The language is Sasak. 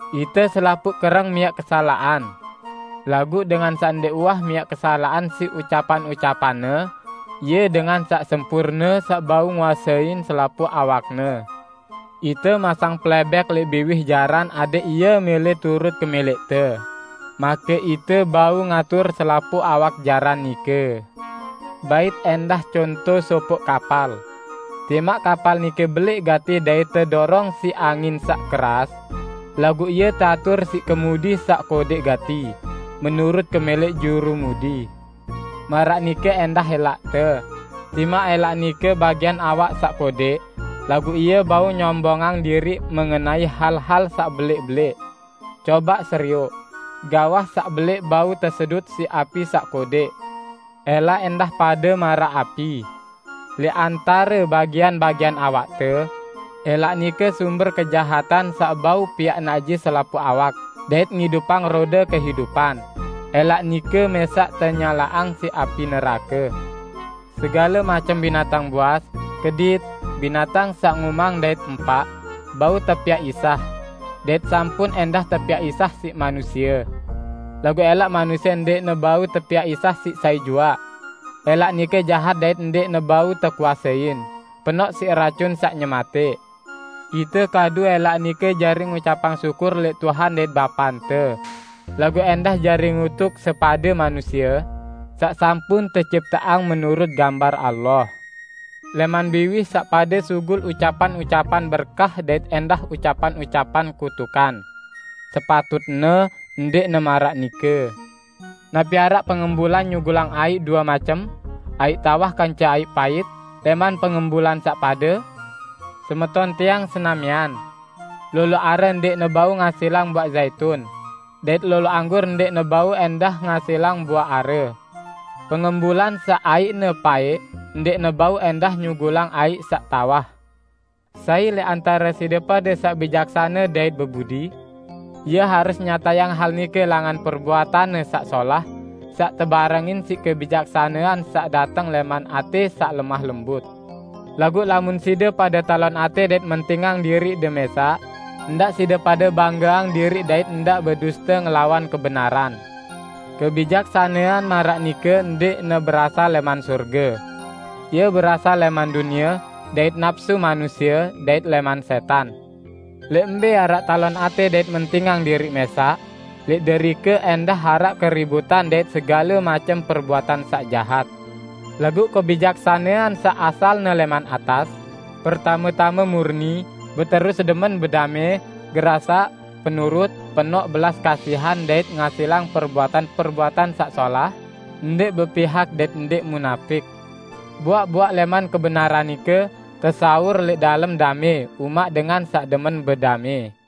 Ite selapuq kereng miaq kesalaqan. Laguq dengan saq ndẽq uwah miaq kesalaqan siq ucapan-ucapanne, ie dengan saq sempurne, saq bau nguasein selapuq awakne. Ite masang plẽbẽk lẽq biwih jaran adẽq ie mẽlẽ turut kemẽlẽqte, make ite bau ngatur selapuq awak jaran nike. Bait ẽndah conto sopoq kapal. Timaq kapal nike belẽq gati dait tedorong siq angin saq keras, laguq ie teatur siq kemudi saq kodẽq gati, menurut kemẽlẽq jurumudi. Maraq nike ẽndah ẽlaqte, timaq ẽlaq nike bagian awak saq kodẽq, laguq ie bau nyombongang diriq mengenai hal-hal saq belẽq-belẽq. Cobaq serioq, gawah saq belẽq bau tesedut siq api saq kodẽq! ~Elaq ẽndah pade maraq api. Lẽq antare bagian-bagian awakte, ẽlaq nike sumber kejahatan saq bau piaq najis selapuq awak dait ngidupang rode kehidupan, ẽlaq nike mẽsaq tenyalaqang siq api nerake. Segale macem binatang buas, kedit, binatang saq ngumang dait empaq, bau tepiaq isah, dait sampun ẽndah tepiaq isah siq manusie. Laguq ẽlaq manusie ndẽqne bau tepiaq isah siq sai juaq. ~Elaq nike jahat dait ndẽqne bau tekuasein; penoq siq racun saq nyematẽq. Ite kadu ẽlaq nike jari ngucapang syukur lẽq Tuhan dait Bapante, laguq ẽndah jari ngutuk sepade manusie, saq sampun tecipteang menurut gambar Allah. Lẽman biwih saq pade sugul ucapan-ucapan berkah dait ẽndah ucapan-ucapan kutukan. Sepatutne ndẽqne maraq nike. Napi araq pengembulan nyugulang aiq due macem, aiq tawah kance aiq pait lẽman pengembulan saq pade? Semeton tiang senamian! Lolo are ndẽqne bau ngasilang buaq Zaitun, dait lolo anggur ndẽqne bau ẽndah ngasilang buaq are. Pengembulan saq aiqne paẽq ndẽqne bau ẽndah nyugulang aiq saq tawah. Sai lẽq antare side pade saq bijaksane dait bebudi? Ie harus nyatayang hal nike langan perbuatanne saq solah saq tebarengin siq kebijaksanean saq dateng lẽman atẽ saq lemah lembut. Laguq lamun side pade talon atẽ dait mentingang diriqde mẽsaq, ndaq side pade banggeang diriq dait ndaq beduste ngelawan kebenaran. Kebijaksanean maraq nike ndẽqne berasal lẽman sorge. Ie berasal lẽman dunie, dait napsu manusie, dait lẽman sẽtan. Lẽq mbẽ araq talon atẽ dait mentingang diriq mẽsaq, lẽq derike ẽndah araq keributan dait segale macem perbuatan saq jahat. Laguq kebijaksanean saq asalne lẽman atas, pertame-tame murni, beterus demen bedamẽ, gerasaq, penurut, penoq belas kasihan dait ngasilang perbuatan-perbuatan saq solah, ndẽq bepihak dait ndẽq munapik. Buaq-buaq lẽman kebenaran nike tesawur lẽq dalem damẽ umaq dengan saq demen bedamẽ.